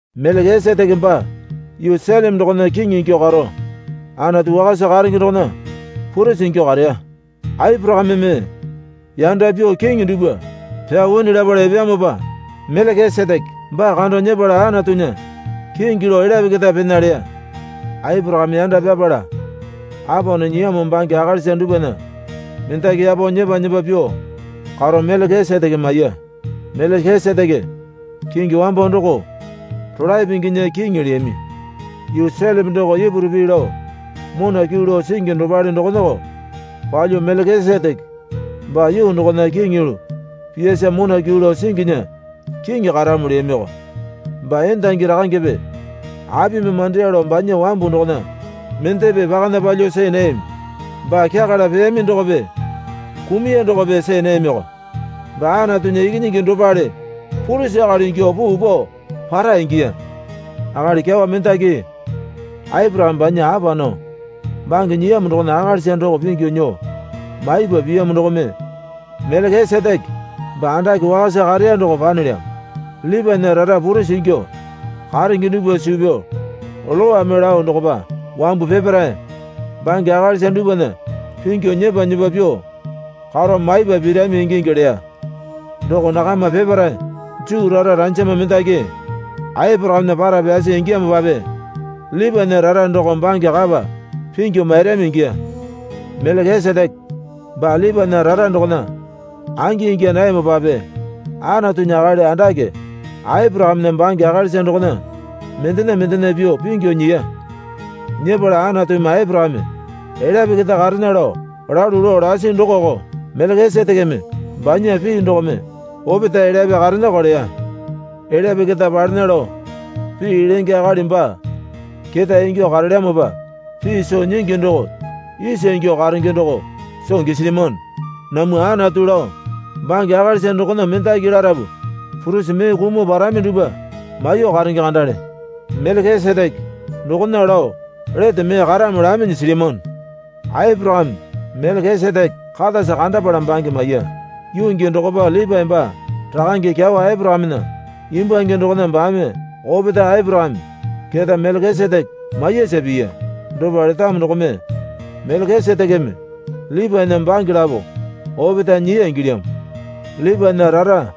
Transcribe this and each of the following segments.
Melekiseteke baa yuu Seleme dokona kiŋi ingyuo karo Anatu wakasa karenge dokona purisi ingyuo kareya. Aporakameme yanda pyuo kiŋi dupwa pyao wini lapala epeyamopa Melekiseteke baa kando nyepala Anatunya kingi lao elyape keta pena leya. Aporakame yanda pyapala apa nao nyiyamo bange akalisa dupwana mendaki yapo nyepa nyepa pyuo karo Melekiseteke maiya. (Melekiseteke kingi wambo doko rolae pinginya kiŋi leyami. Yuu Seleme doko Ipuru pii lao mona kyuu lao singi dopale dokonako palyuo Melekiseteke baa yuu dokopa kiŋi yulu piyasa mona kyuu lao singinya kiŋi karamo leyamiko.) Baa endangi rakangepe apimi mandeya lao banya wambu dokona mendepe pakana palyuo see nayami. Baa kyakala peyami dokope kumuya dokope see nayamioko. Baa Anatunya Ikinyingi dopale purisi akali ingyuo puu pao para ingiya. Akali kyawa mendaki Aporakame banya apa nao bange nyiyamo dokona akalisa doko pingyu nyuo maipa piyamo dokome Melekiseteke baa andake wakasa kareya doko panelyamo. Lipaena rara purisi ingyuo karenge dupwa suu pyao Lowame lao dokopa wambu peparae bange akalisa dupwana pingyu nyepa nyepa pyuo karo maipa pirami ingingi leya. Doko nakama peparae Juu rara ranjama mendaki Aporakamena para pyasi ingiyamopape Lipaena rara doko bange kapa pingyu mairami ingiya. Melekiseteke baa Lipaena rara dokona angi ingya nayamopape Anatunya akali andake Aporakamena bange akalisa dokona mendena mendena pyuo pingyu nyiya. Nyepala Anatumi Aporakame elyape keta karena lao lalu lao lasi dokoko Melekisetekeme banya pii dokome opetae elyape karenako leya. Elyape keta palena lao pii lenge akali baa ketae ingyuo karelyamopa pii soo nyingi doko isa ingyuo karenge doko soo gisilyamano. Namwa Anatu lao bange akalisa dokona mendaki larapu purisi mee kumuo parami dupwa maiyuo karenge kandale. Melekiseteke dokona lao lete mee karamo laminyi silyamano. Aporakame Melekiseteke katasa kandapala bange maiya. Yuu gii dokopa Lipae baa rakange kyawa Aporakamena imbwange dokona baame opetae Aporakame keta Melekiseteke maiyasa piya. Dopa letamo dokome Melekisetekeme Lipaena bange lapo opetae nyiya ingilyamo. Lipaena rara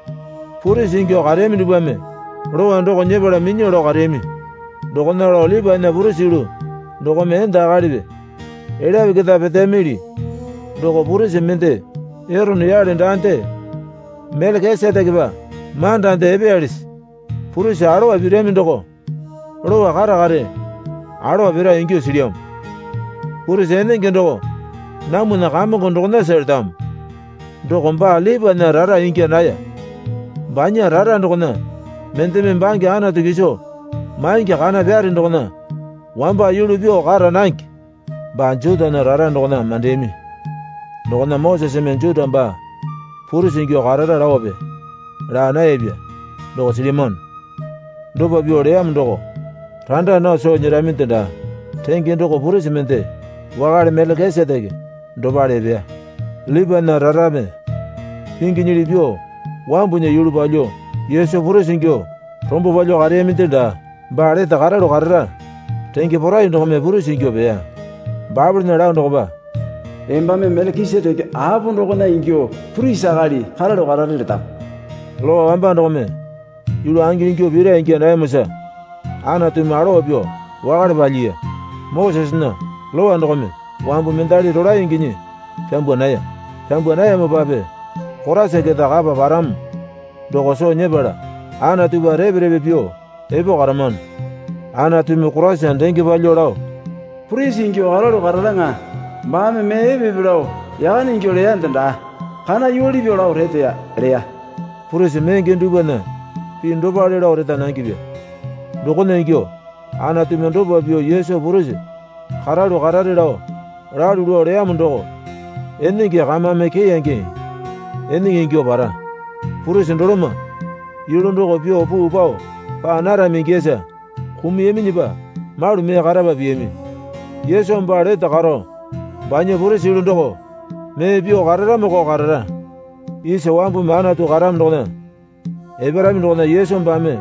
purisi ingyuo kareyami dupwame Lowa doko nyepala minyuo lao kareyami. Dokona lao Lipaena purisi yulu dokome enda akalipi elyape keta peteyamili doko purisi mende Erone yale daande Melekisetekepa mandande epeyalisi? Purisi alowa pirami doko lowa kare kare alowa pira ingyuo silyamo. Purisi enenge doko namwana Kamongo dokonasa letamo. Doko baa Lipaena rara ingya naya. Banya rara dokona mendeme bange Anatu kiso maingi kana pyare dokona wamba yulu pyuo kara nange. Baa Jutana rara dokona mandeyami dokona Moseseme Juta baa purisi ingyuo karara laope laa nayapya doko silyamano. Dopa pyuo leyamo doko randa nao soo nyeraminde daa. Renge doko purisi mende wakale Melekiseteke dopale epeya. Lipaena rarame pinginyili pyuo wambunya yulu palyuo Yesu purisi ingyuo rombo palyuo kareyaminde daa. Baa lete karalu karara renge porai dokome purisi ingyuo peya. Baepolena lao dokopa, Embame Melekiseteke apo dokona ingyuo purisi akali karalu karare letamo. Lowa wamba dokome yulu angi ingyuo pira ingya nayamosa Anatumi alowa pyuo wakale palyiya. Mosesena Lowa dokome wambu mendali rolae inginyi pyambwa naya. Pyambwa nayamopape Koraisa keta kapa paramo doko soo nyepala Anatupa repe repe pyuo epo karamano. Anatumi Koraisa denge palyuo lao, Purisi ingyuo karalu kararaŋa baame mee epe epe lao yakane ingyuo leyande daa. Kana yuwale pyuo lao reteya, leya. Purisi menge dupwana pii dopale lao reta nangepya. Dokona ingyuo Anatumi dopa pyuo Yesu purisi karalu karare lao lalu lao leyamo doko enenge kamame keyange enenge ingyuo para. Purisi doloma yulu doko pyuo puu pao paa narami ingiyasa kumuyaminyipa malu mee karapa piyami. Yesu baa lete karo banya purisi yulu doko mee pyuo kararamoko karara. Isa wambumi Anatu karamo dokona eparami dokona Yesu baame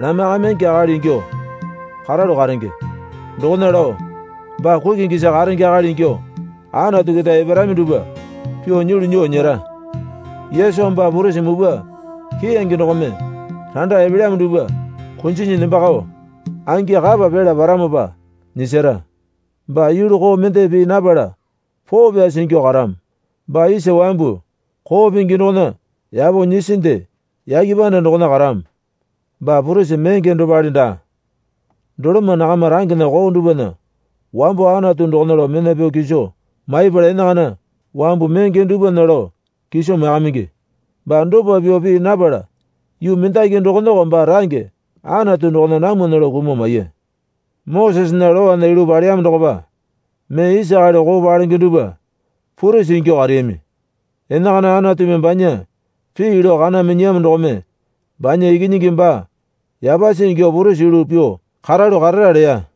lamaiyakamingi akali ingyuo karalu karenge. Dokona lao baa kukingisa karenge akali ingyuo Anatu keta eparami dupwa pyuo nyulu nyuo nyera. Yesu baa purisi mupwa keyange dokome randa epelyamo dupwa kunjinyi nembakao angi kapa pyala paramopa nyisara. Baa yulu koo mende pii napala poo pyasi ingyuo karamo. Baa isa wambu koo pingi dokona yapo nyisinde yake panda dokona karamo. Baa purisi menge dopale daa. Doloma nakama rangena koo dupwana wambo Anatu dokona lao mena pyao kiso maipala enakana wambu menge dupwana lao kiso maiyakamingi. Baa dopa pyuo pii napala yuu mendaki dokonako baa range Anatu dokona namwana lao kumuo maiya. Mosesena Lowana yulu paleyamo dokopa mee isa akali koo palenge dupwa purisi ingyuo kareyami. Enakana Anatumi banya pii lao kana minyiyamo dokome banya Ikinyingi baa yapasi ingyuo purisi yulu pyuo karalu karara leya.